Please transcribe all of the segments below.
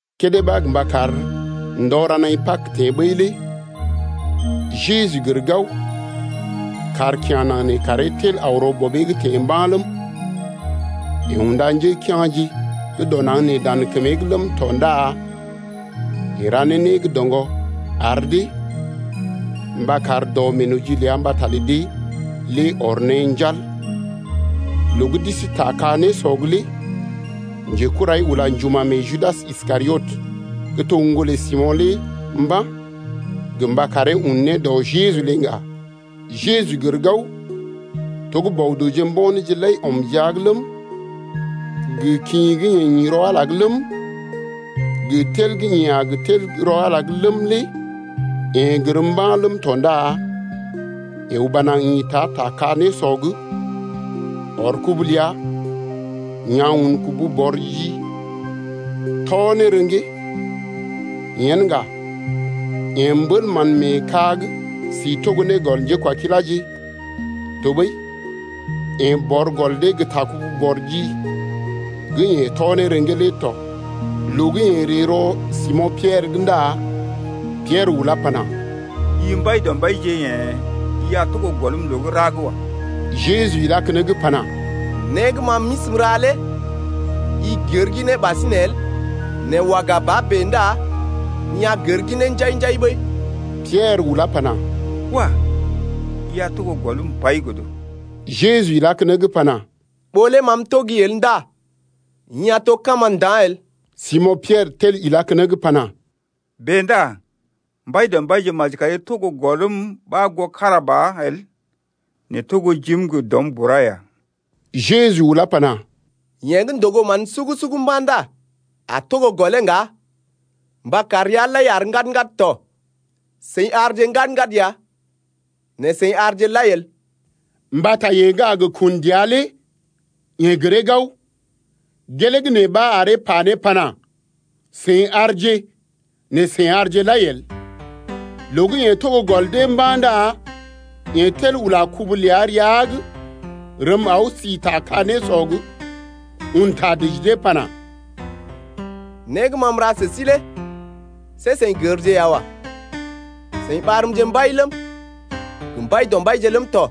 Kédé ɓa gə mba kar ndɔ ra naḭ Pag teḛ ɓəi lé Jeju gər gao, kàr kya̰ naŋg nee karee tel aw rɔ Bɔbee’g teḛ mba̰ ləm, yeḛ unda njékea̰je gə́ dɔ naŋg nee dan kəmee’g ləm tɔ ndá, yeḛ ra ne né gə́ doŋgɔ ar dee mba kar dɔ meenoji ləa mbata lə dee lé ɔr ne njal. Loo gə́ d’isi ta ka-nésɔ’g lé njekurai ula njuma̰ mee Judas Iskariot gə́ to ŋgolə Simo̰ lé mba̰ gə mba karee un ne dɔ Jeju lé ŋga. Jeju gər gao to gə́ Bɔ-dəwje mbo̰ néje lai ɔm jia’g ləm, gə kḭ gə́ yeḛ ḭ rɔ Ala’g ləm, gə tel gə́ yeḛ a gə tel gə́ rɔ Ala’g ləm lé yeḛ gər mba̰ ləm tɔ ndá yeḛ uba naŋg ḭta ta ka-nésɔ’g ɔr kubu ləa ya̰ un kubu-bɔr-ji tɔ ne rḛgee. Yen ŋga yeḛ mbél mán mee ka’g si togo ne gɔl njékwakiláje, tɔɓəi yeḛ bɔr gɔl dee gə ta kubu-bɔr-ji gə́ yeḛ tɔ ne rḛgee lé tɔ. Loo gə́ yeḛ ree rɔ Simo̰ Piɛrə’g ndá Piɛrə ulá pana: I Mbaidɔmbaije yḛ̀ i a togo gɔlm loo gə́ ra’g wa. Jeju ilá keneŋ pana: Né gə́ ma m’isi m’ra lé i gər ginee ɓasinè el nɛ waga ba bèe ndá i a gər ginee njai-njai ɓəi. Piɛrə ulá pana: Wah! i a togo gɔlm pai godo. Jeju ilá keneŋ pana: Ɓó lé ma M’tɔgi el ndá i a to kama nda̰ el. Simo̰ Piɛrə tel ilá keneŋ pana: Bèe ndá Mbaidɔmbaije, maji kari togo gɔlm ɓa goo kára ba el, nɛ togo jim gə dɔm bura ya. Jeju ulá pana: Yeḛ gə́ ndogo mán sugu-sugu mba̰ ndá a togo gɔlee ŋga mba kar rəa lai àr ŋgad-ŋgad tɔ. Seḭ àrje ŋgad-ŋgad ya nɛ seḭ àrje lai el. Mbata yeḛ gə́ a gə kun dəa lé yeḛ gəree gao, gelee gə́ nee ɓa aree pa ne pana: Seḭ àrje, nɛ seḭ àrje lai el. Loo gə́ yeḛ togo gɔl dee mba̰ ndá yeḛ tel ula kubu ləa rəa’g rəm aw si ta ka-nésɔ’g, un ta dəji dee pana: Né gə́ ma m’ra sə sí lé see seḭ gərje ya wa. Seḭ ɓarmje Mbai ləm, gə Mbaidɔmbaije ləm tɔ,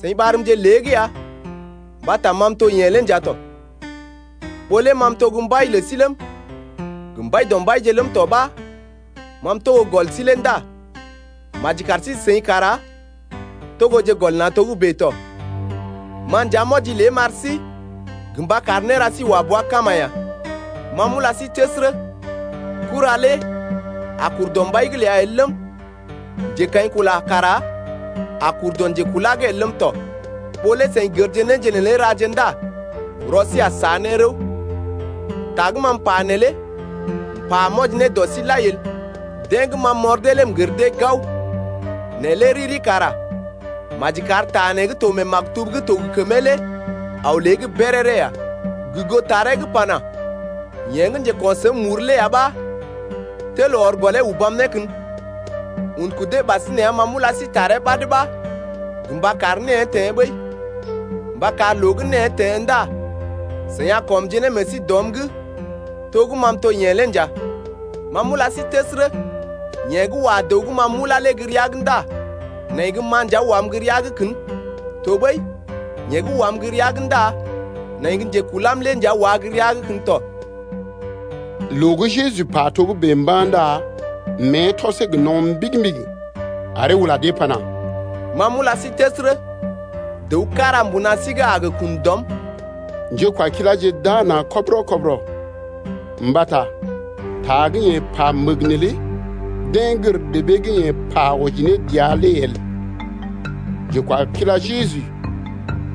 seḭ ɓarmje lée’g ya mbata ma m’to yeḛ lé nja tɔ. Ɓó lé ma gə́ m’to Mbai lə sí ləm, gə Mbaidɔmbaije ləm tɔ ɓa ma m’togo gɔl sí lé ndá maji kar sí-seḭ kara togoje gɔl na̰ togə́bè tɔ. Ma nja m’wɔji lé m’ar sí gə mba kar néra sí wa bua kama ya. Ma m’ula sí təsərə, kura lé a kur dɔ mbai’g ləa el ləm, njekaḭkula kara a kur dɔ njekulá’g el ləm tɔ. Ɓó lé seḭ gərje néje neelé raje ndá rɔ sí a sa ne rəw. Ta gə́ m’pa neelé m’pa m’wɔji ne dɔ sí lai el, deḛ gə́ ma m’ɔr dee lé m’gər dee gao. Nɛ lé riri kara maji kar ta nee gə́ to mee maktub gə́ to gə kəmee lé aw lée’g béréré ya gə goo taree gə́ pana: Yeḛ gə́ njeko̰ səm muru lé ya ɓa tel ɔr gɔlee ubam ne kən Un kudee ɓasinè ya ma m’ula sí taree ɓad ɓa gə mba kar née teḛ ɓəi, mba kar loo gə́ née teḛ ndá seḭ a kɔmje ne meḛ sí dɔm’g to gə́ ma m’to yeḛ lé nja. Ma m’ula sí təsərə, yeḛ gə́ wa dəw gə́ ma m’ulá lé gə́ rəa’g ndá nai gə́ ma nja wam gə́ rəa’g kən tɔɓəi yeḛ gə́ wam gə́ rəa’g ndá nai gə́ njekulam ya wá gə rəa’g kən tɔ. Loo gə́ Jeju pa togə́bè mba̰ ndá mée tɔsee gə no̰ mbigi-mbigi aree ula dee pana: Ma m’ula sí təsərə, dəw kára mbuna sí’g a gə kun dɔm. Njékwakiláje d’aa na̰ kɔbərɔ-kɔbərɔ mbata ta gə́ yeḛ pa məg neelé deḛ gər debee gə́ yeḛ pa wɔji ne dəa lé el. Njekwakila Jeju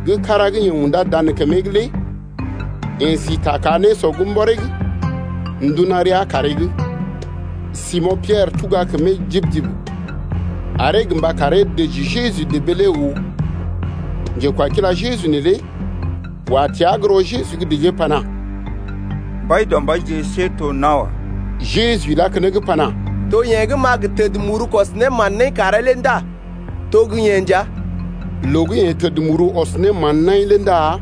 gə́ kára gə́ yeḛ undá dan kəmee’g lé yeḛ si ta ka-nésɔ’g mbɔree’g, nduna rəa kaaree’g. Simo̰ Piɛrə tuga kəmee jib-jib aree gə mba karee dəji Jeju debee lé oo. Njekwakila Jeju neelé wa təa gə́ rɔ Jeju’g dəjee pana: Mbaidɔmbaije, see to nawa. Jeju ilá keneŋ pana: To yeḛ gə́ m’a gə təd muru kɔs ne mán-naḭ karee lé ndá to gə́ yeḛ nja. Loo gə́ yeḛ təd muru ɔs ne mán-naḭ lé ndá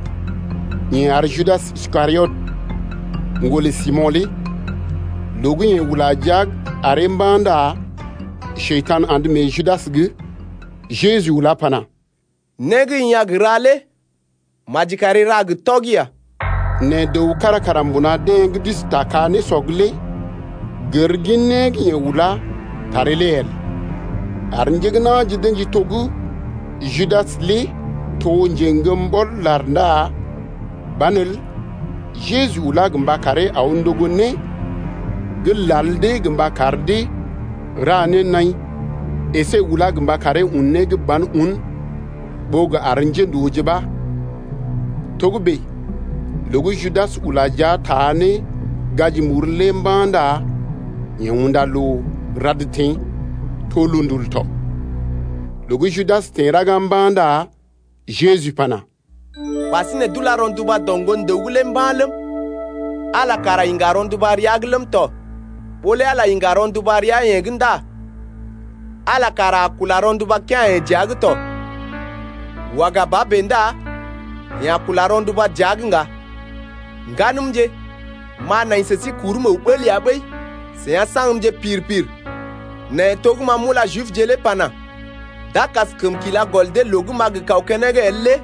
yeḛ ar Judas Iskariot, ŋgolə Simo̰ lé. Loo gə́ yeḛ ula jia’g aree mba̰ ndá Njekurai andə mee Judas’g. Jeju ulá pana: Né gə́ i a gə ra lé maji kari ra gə tɔgi ya. Nɛ dəw kára kara mbuna deḛ gə́ d’isi ta ka-nésɔ’g lé gər gin né gə́ yeḛ ulá taree lé el, ar njé na̰je d’ə̰ji to gə́ Judas lé to njeŋgəm ɓɔl-lar ndá banelə Jeju ulá gə mba karee aw ndogo né gə́ lal dee gə mba kar dee ra ne naḭ, əsé ulá gə mba karee un né gə́ ban un ɓó gə ar njéndooje ɓa. Togə́bè loo gə́ Judas ula jia taa ne gaji muru lé mba̰ ndá yeḛ unda loo rad teḛ. To loondul tɔ. Loo gə́ Judas teḛ raga mba̰ ndá Jeju pana: Ɓasinè d’ula rɔnduba dɔ Ŋgon-dəw’g lé mba̰ ləm, Ala kara iŋga rɔnduba rəa’g ləm tɔ. Ɓó lé Ala iŋga rɔnduba rəa-yeḛ’g ndá Ala kara a kula rɔnduba kea̰-yeḛ dəa’g tɔ, waga ba bèe ndá yeḛ a kula rɔnduba dəa’g ŋga. Ŋganəmje, m’a nai sə sí kurm əw bəl ya ɓəi. Seḭ a saŋgmje pir-pir nɛ to gə́ ma m’ula Jibje lé pana: D’a kaskəm kila gɔl dee loo gə́ m’a gə kaw keneŋ el lé el,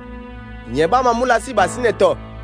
yee ɓa ma m’ula sí ɓasinè tɔ.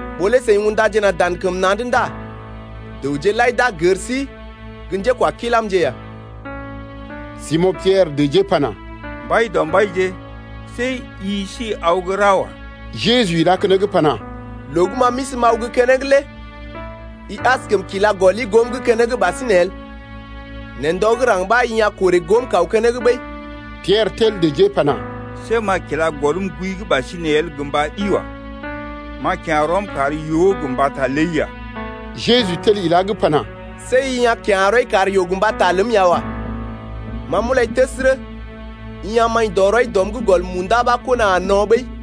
Ɓó lé seḭ undaje na̰ dan kəm na̰’d ndá dəwje lai d’a gər sí gə́ njékwakilamje ya. Simo̰ Piɛrə dəjee pana: Mbaidɔmbaije, see i si aw gə́ ra wa. Jeju ilá keneŋ pana: Loo gə́ ma m’isi m’aw gə́ keneŋ lé i askəm kila gɔli goom’g keneŋ ɓasinè el. Nɛ ndɔ gə́ raŋg ɓa i a korè goom kaw keneŋ ɓəi. Piɛrə tel dəjee pana: See m’a kila gɔlm gooi’g ɓasinè el gə mba ɗi wa. M’a kya̰ rɔm kar yoo gə mbata ləi ya. Jeju tel ilá’g pana: See i a kya̰ rɔi kar yoo gə mbata ləm ya wa. Ma m’ulai təsərə, i a maḭ dɔ rɔi dɔm’g gɔl munda ɓa kona a no̰ ɓəi.